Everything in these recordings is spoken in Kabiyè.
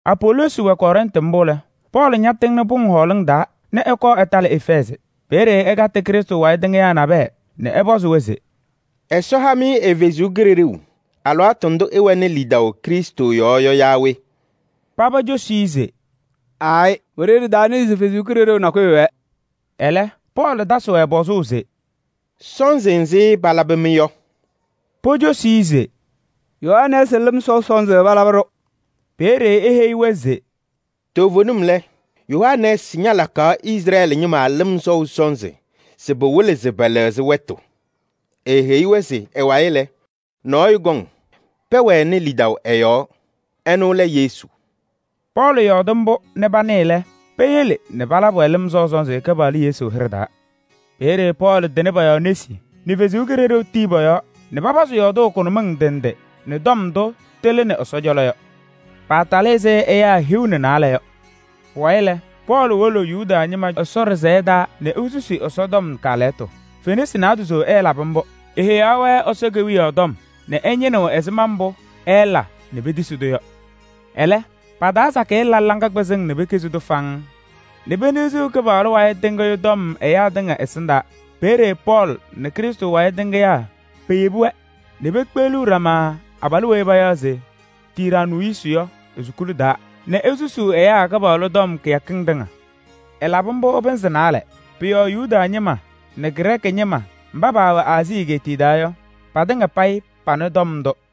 Apoloosi wɛ Kɔrɛntɩ mbʋ lɛ, Pɔɔlɩ ñatɩŋnɩ pʋŋ hɔɔlɩŋ taa nɛ ɛkɔɔ ɛtalɩ Efɛɛzɩ. Peeye ɛkatɩ Krɩstʋ wayɩ tɩŋɩyaa nabɛyɛ nɛ ɛpɔzɩ-wɛ se: “Ɛsɔ ha-mɩ ɛ-Kalɩzaɣ alɩwaatʋ ndʋ ɩwɛnɩ lidaʋ Krɩstʋ yɔɔ yɔ yaa we?” Paba cosi-i se: “Aayɩ! Wiɖiyi ɖɩtanɩɩ se Ɛsɔ Kalɩzaɣ nakɛyɛ wɛɛ.” Ɛlɛ Pɔɔlɩ tasɩ-wɛ pɔzʋʋ se: “Sɔnzɩ nzɩ palabɩ-mɩ yɔ?” Pocosi-i se: “Yohanɛɛsɩ lɩm sɔʋ sɔnzɩ palabɩ-ɖʋ.” Peeye eheyi-wɛ se: “Toovenim lɛ, Yohanɛɛsɩ ñalakaɣ Izrɛɛlɩ ñɩma lɩm sɔʋ sɔnzɩ se pɩwɩlɩ se pɛlɛɣzɩ wɛtʋ. Eeheyi-wɛ se ɛ-wayɩ lɛ, nɔɔyʋ kɔŋ, pɛwɛnɩ lidaʋ ɛ-yɔɔ. Ɛnʋ lɛ Yesu.” Pɔɔlɩ yɔɔdɩ mbʋ nɛ panɩɩ lɛ, peyele nɛ palabɩ-wɛ lɩm sɔʋ sɔnzɩ Kɩpaɣlʋ Yesu hɩɖɛ taa. Peeye Pɔɔlɩ tɩnɩ pɔ-yɔɔ nesi nɛ Ɛsɔ Kalɩzaɣ tii pɔ-yɔɔ nɛ papazɩ yɔɔdʋʋ kʋnʋmɩŋ ndɩ ndɩ nɛ tɔm ndʋ tɩlɩnɩ Ɛsɔ cɔlɔ yɔ. Paatalɩ ɛzɩ ɛyaa hiu nɛ naalɛ yɔ. Pʋwayɩ lɛ, Pɔɔlɩ wolo Yuda ñɩma Ɛsɔ ɖɩsɛyɛ taa nɛ esusi Ɛsɔtɔm kaalɛyɩtʋ. Fenasɩ naadozo ɛɛlabɩ mbʋ. Eheyaɣ-wɛ Ɛsɔ Kewiyaɣ tɔm nɛ ɛñɩnɩɣ ɛzɩma mbʋ ɛɛla nɛ petisi-tʋ yɔ. Ɛlɛ, pa-taa sakɩyɛ la laŋa kpɩzɩŋ nɛ pekizi-tʋ faŋŋ nɛ peniɣziɣ Kɩpaɣlʋ wayɩ tɩŋʋʋ tɔm ɛyaa tɩŋa ɛsɩndaa. Peeye Pɔɔlɩ nɛ Krɩstʋ wayɩ tɩŋɩyaa peyebi-wɛ nɛ pekpeɣliɣ ɖama abalʋ weyi payaɣ se Tiraanuusi yɔ e-sukuli taa nɛ esusuu ɛyaa Kɩpaɣlʋ tɔm kɩyakɩŋ tɩŋa. Ɛlabɩ mbʋ pɩnzɩ naalɛ. Pʋ-yɔɔ Yuda ñɩma nɛ Grɛɛkɩ ñɩma mba paawɛ Aazii egeetiye taa yɔ, patɩŋa payɩ panɩ tɔm ndʋ.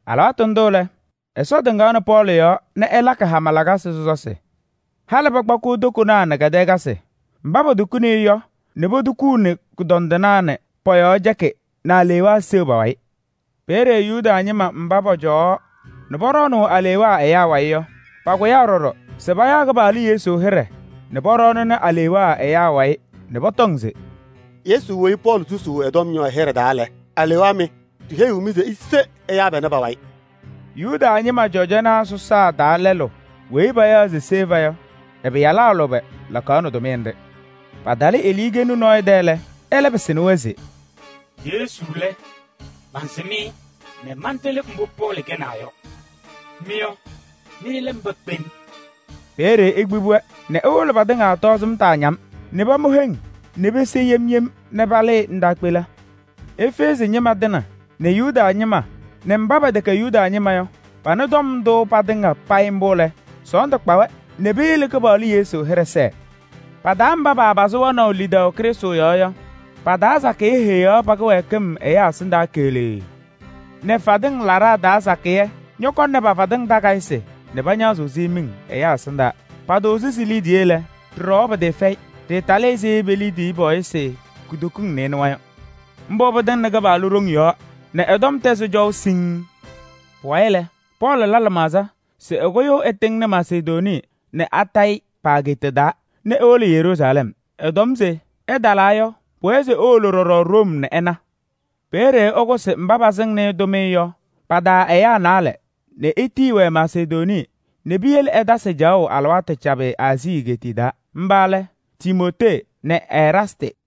Alɩwaatʋ ndʋ lɛ, Ɛsɔ tɩŋaɣnɩ Pɔɔlɩ yɔɔ nɛ ɛlakɩ hama lakasɩ sɔsɔsɩ. Halɩ pakpakɩɣ tokonaa nɛ kɛdɛɛkasɩ mba potukuni-i yɔ nɛ potukuuni kʋdɔndɩnaa nɛ pɔ-yɔɔ cɛkɩ nɛ alewaa seɣ pa-wayɩ. Peeye Yuda ñɩma mba pɔcɔwaɣ nɛ pɔɖɔɔnʋʋ alewaa ɛyaa wayɩ yɔ, pakʋyaa ɖɔɖɔ se payaɣ Kɩpaɣlʋ Yesu hɩɖɛ nɛ pɔɖɔɔnɩnɩ alewaa ɛyaa wayɩ nɛ pɔtɔŋ se: “Yesu weyi Pɔɔlɩ susuu ɛ-tɔm yɔ ɛ-hɩɖɛ taa lɛ, alewaa mɩ! Ɖiheyiɣ-mɩ se ise ɛyaa panɛ pa-wayɩ!” Yuda ñɩma cɔjɔnaa sɔsaa taa lɛlʋ weyi payaɣ se Seva yɔ, ɛ-pɩyalaa lʋbɛ lakaɣnɩ tʋmɩyɛ nɖɩ. Patalɩ eluukenu nɔɔyʋ tɛ lɛ, ɛlɛ pɩsɩnɩ-wɛ se: “Yesu lɛ, mansɩm-ɩ nɛ mantɩlɩ mbʋ Pɔɔlɩ kɛnaa yɔ. Mɩ yɔ, mɩ lɛ mba kpem?” Peeye ekpibi-wɛ nɛ ɛwɩlɩ patɩŋa tɔɔzɩm taaña-m nɛ pamʋ heŋ nɛ pese yem yem nɛ palɩɩ ndaakpela. Efɛɛzɩ ñɩma tɩŋa nɛ Yuda ñɩma nɛ mba pɛtɛkɛ Yuda ñɩma yɔ panɩ tɔm ndʋ patɩŋa payɩ mbʋ lɛ, sɔɔndʋ kpa-wɛ nɛ peyele Kɩpaɣlʋ Yesu hɩɖɛ sɛɛ. Pa-taa mba paapazɩ wɛnaʋ lidaʋ Krɩstʋ yɔɔ yɔ, pa-taa sakɩyɛ heyaɣ pa-kɩwɛɛkɩm ɛyaa ɛsɩndaa keɣlee nɛ fadɩŋ laɖaa taa sakɩyɛ ñɔkɔnɩ pa-fatɩŋ takayɩsɩ nɛ pañaɣzɩ-sɩ miŋ ɛyaa ɛsɩndaa. Patʋʋzɩ si-liidiye lɛ, ɖɩɖɔwa pɩtɩɩfɛyɩ: ɖɩɩtalɩ ɛzɩ pe-liidiye pɔɔyɩsɩ kutokiŋ nɩɩnʋwa yɔ. Mbʋ pɩtɩŋnɩ Kɩpaɣlʋ ɖoŋ yɔɔ nɛ ɛ-tɔm tɛzɩ cɔʋ siŋŋ. Pʋwayɩ lɛ, Pɔɔlɩ la lɩmaɣza se ɛkʋyʋʋ ɛtɩŋnɩ Masedonii nɛ Akayɩ pa-ageeta taa nɛ ewolo Yeruusalɛm. Ɛtɔm se ɛtalaa yɔ, pʋwɛɛ se ewolo ɖɔɖɔ Room nɛ ɛna. Peeye ɛkʋsɩ mba pasɩŋaɣnɩ-ɩ tʋmɩyɛ yɔ pa-taa ɛyaa naalɛ nɛ etiyi-wɛ Masedonii nɛ piyele ɛtasɩ caɣʋ alɩwaatʋ cabɩ Aazii egeetiye taa. Mba lɛ Timootee nɛ Eraastɩ.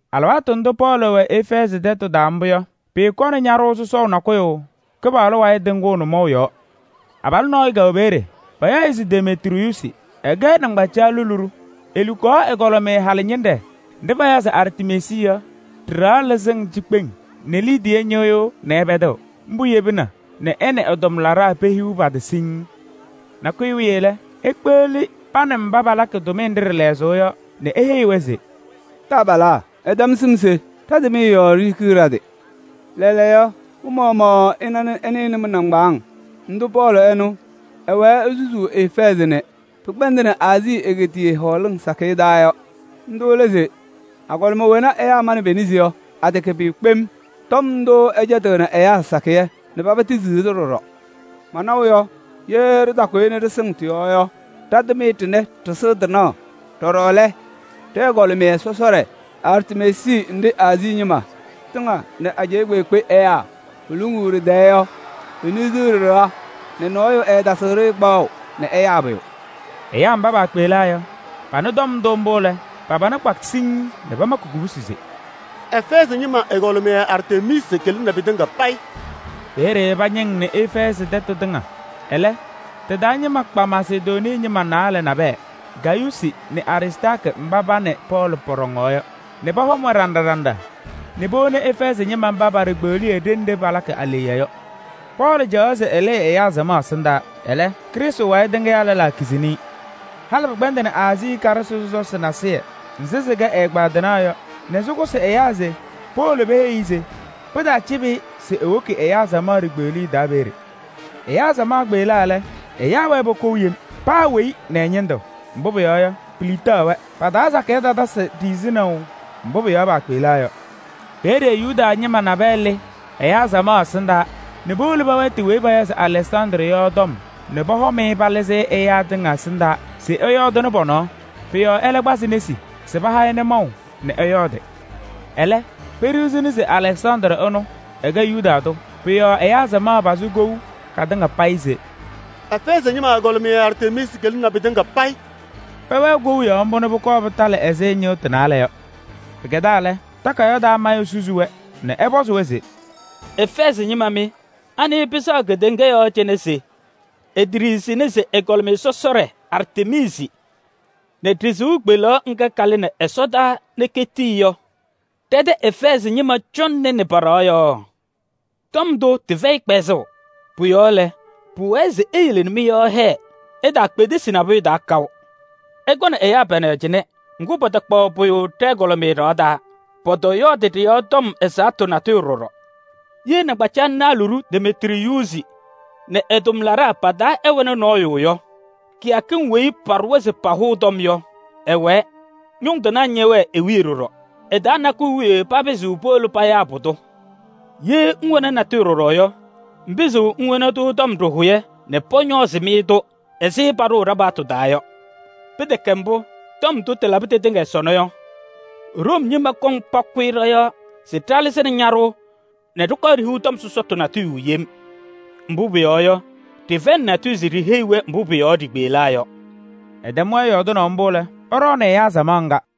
Alɩwaatʋ ndʋ Pɔɔlɩ wɛ Efɛɛzɩ tɛtʋ taa mbʋ yɔ, pɩɩkɔnɩ ñaɖʋʋ sɔsɔʋ nakʋyʋ Kɩpaɣlʋ wayɩ tɩŋʋʋ nʋmɔʋ yɔɔ. Abalʋ nɔɔyʋ kɛwɛ peeye, payaɣ-ɩ se Demetriyuusi, ɛkɛ nɩŋgbacaɣlɩnaa luɖu. Elukaɣ ɛgɔlɩmɩyɛ halɩñɩnɖɛ nɖɩ payaɣ se Artemiisi yɔ ɖɩ-ɖɩɣa lɛzɩŋ cikpeŋ nɛ liidiye ñɩɣyʋʋ nɛ ɛpɛdɩɣ. Mbʋ yebina nɛ ɛ nɛ ɛ-tʋmlaɖaa pehiɣ pa-tɩ siŋŋ. Nakʋyʋ wiye lɛ, ekpeɣli pa nɛ mba palakɩ tʋmɩyɛ nɖɩ ɖɩ-lɛzʋʋ yɔ nɛ eheyi-wɛ se: “Taabalaa! Ɩtɛm sɩm se ɖa-tʋmɩyɛ yɔɔ ɖihikiɣ ɖa-tɩ. Lɛɛlɛɛyɔ, mɩ-maɣmaɣ ɩnaɣ nɛ ɩnɩɣ nɛ mɩ-nɩŋgbaaŋ ndʋ mɩ-Pɔɔlɩ ɛnʋ ɛwɛɛ esusuu Efɛɛzɩ nɛ pɩkpɛndɩnɩ Aazii egeetiye hɔɔlɩŋ sakɩyɛ taa yɔ. Ndʋ lɛ se agɔlɩma wena ɛyaa manɩ pe-nesi yɔ, atɛkɛ pʋyʋ kpem. Tɔm ndʋ ɛcɛtɩɣnɩ ɛyaa sakɩyɛ nɛ paba tisiɣ-tʋ ɖɔɖɔ. Manaʋ yɔ, ye ɖɩtakʋyɩ ɖɩsɩŋ tɔm ndʋ tɩ-yɔɔ yɔ, ɖa-tʋmɩyɛ ɖɩnɛ ɖɩsɩɣ tɩnaɣ! Ɖɔɖɔ lɛ, ɖɛ-ɛgɔlɩmɩyɛ sɔsɔɖɛ Artemiisi nɖɩ Aazii ñɩma tɩŋa nɛ ajɛɛ kpeekpe ɛyaa poluŋuu ɖɩ-tɛɛ yɔ, peniɣziɣ ɖɩ-ɖɩɣa nɛ nɔɔyʋ ɛɛtasɩɣ-ɖɩ kpaɣʋ nɛ ɛyaa pʋyʋ!” Ɛyaa mba paakpeɣlaa yɔ, panɩ tɔm ndʋ mbʋ lɛ, pa-pana kpa siŋŋ nɛ pamakɩ kubusi se: “Efɛɛzɩ ñɩma ɛgɔlɩmɩyɛ Artemiisi kɩlɩnɩ pɩtɩŋa payɩ!” Peeye pɩñɩŋnɩ Efɛɛzɩ tɛtʋ tɩŋa. Ɛlɛ tɩ-taa ñɩma kpa Masedonii ñɩma naalɛ nabɛyɛ: Gayuusi nɛ Aristaarkɩ mba pa nɛ Pɔɔlɩ pɔɖɔŋaɣ yɔ, nɛ pɔhɔm-wɛ ɖinɖa ɖinɖa nɛ powoni Efɛɛzɩ ñɩma mba pa-ɖikpeɣliye ɖenɖe palakɩ aleɣya yɔ. Pɔɔlɩ caɣaɣ se ɛlɩɩ ɛyaa samaɣ ɛsɩndaa. Ɛlɛ, Krɩstʋ wayɩ tɩŋɩyaa lɛlaa kizini-i. Halɩ pɩkpɛndɩnɩ Aazii karɩsɩ sɔsɔsɩ nasɩyɩ nzɩ sɩkɛ ɛ-ɛgbaadɩnaa yɔ nɛ sɩkʋsɩ ɛyaa se powolo peheyi-i se pɩtaacɩbɩ-ɩ se ewoki ɛyaa samaɣ ɖikpeɣliye taa peeye. Ɛyaa samaɣ kpeɣlaa lɛ, ɛyaa wɛɛ pokou yem: paa weyi nɛ ɛ-ñɩndʋ. Mbʋ pʋyɔɔ yɔ, piliɣtaɣ-wɛ. Pa-taa sakɩyɛ tatasɩ ɖiɣzinaʋ mbʋ pʋ-yɔɔ paakpeɣlaa yɔ. Peeye Yuda ñɩma nabɛyɛ lɩ ɛyaa samaɣ taa nɛ powolo pɛwɛɛtɩ weyi payaɣ se Alɛksandrɩ yɔ tɔm nɛ pɔhɔm-ɩ palɩzɩ ɛyaa tɩŋa ɛsɩndaa se ɛyɔɔdɩnɩ pɔ-nɔɔ. Pʋ-yɔɔ ɛlɛ kpazɩ nesi se paha-ɩ nʋmɔʋ nɛ ɛyɔɔdɩ. Ɛlɛ, peɖiɣzini se Alɛksandrɩ ɛnʋ, ɛkɛ Yuda tʋ. Pʋ-yɔɔ ɛyaa samaɣ pazɩ kou katɩŋa payɩ se: “Efɛɛzɩ ñɩma ɛgɔlɩmɩyɛ Artemiisi kɩlɩnɩ pɩtɩŋa payɩ!” Pɛwɛɛ kou yɔɔ mbʋ nɛ pʋkɔɔ pɩtalɩ ɛzɩ ñɩɣtʋ naalɛ yɔ. Pɩkɛdaa lɛ, takayaɣ taa mayʋ susi-wɛ nɛ ɛpɔzɩ-wɛ se: “Efɛɛzɩ ñɩma mɩ! Anɩ pɩsɛɣ kedeŋa yɔɔ cɩnɛ se eteɖiɣzini se ɛgɔlɩmɩyɛ sɔsɔɖɛ Artemiisi nɛ ɖɩ-sɩʋ kpeleɣ ŋga kalɩnɩ ɛsɔdaa nɛ ketii yɔ, ɖɛ-tɛ Efɛɛzɩ ñɩma cɔŋnɩnɩ pa-ɖɩɣa yɔɔ? Tɔm ndʋ tɩfɛyɩ kpɛzʋʋ. Pʋ-yɔɔ lɛ, pʋwɛɛ se iyele nɛ mɩ-yɔɔ hɛɛ, ɩtaakpedesi nabʋyʋ taa kaʋ. Ɩkɔnɩ ɛyaa panɛ cɩnɛ, ŋgʋ, patakpaɣ pʋyʋ ɖɛ-ɛgɔlɩmɩyɛ ɖɩɣa taa, pɔtɔyɔɔdɩ ɖɩ-yɔɔ tɔm ɛzaɣtʋ natʋyʋ ɖɔɖɔ. Ye nɩŋgbacaɣlɩnaa luɖu Demetriyuusi nɛ ɛ-tʋmlaɖaa pa-taa ɛwɛnɩ nɔɔyʋ yɔ, kɩyakɩŋ weyi paɖʋwa se pahʋʋ tɔm yɔ, ɩwɛɛ. Ñʋŋ tɩnaa ñɛwɛɣ i-wiye ɖɔɖɔ. Ɩ-taa nakʋyʋ wiye papɩzɩɣ powolo payaa pʋdʋ! Ye ɩwɛnɩ natʋyʋ ɖɔɖɔ yɔ, ɩpɩzɩɣ iwoni-tʋ tɔm ɖɩhʋyɛ nɛ pɔñɔɔzɩ-mɩ-tʋ ɛzɩ paɖʋʋ ɖa-paɣtʋ taa yɔ. Pɩtɛkɛ mbʋ, tɔm ndʋ tɩtɩŋa tɩlabɩ sɔnɔ yɔ, Room ñɩma kɔŋ pakʋyɩ ɖɔ-yɔɔ se ɖalɩzɩnɩ ñaɖʋʋ nɛ ɖɩkɔɔ ɖihiɣ tɔm sɔsɔtʋ natʋyʋ yem. Mbʋ pʋyɔɔ yɔ, ɖɩfɛyɩnɩ natʋyʋ se ɖiiheyi-wɛ mbʋ pʋ-yɔɔ ɖikpeɣlaa yɔ.” Ɛtɛm-wɛ yɔɔdɩnaʋ mbʋ lɛ, ɛɖɔɔnɩ ɛyaa samaɣ ŋga.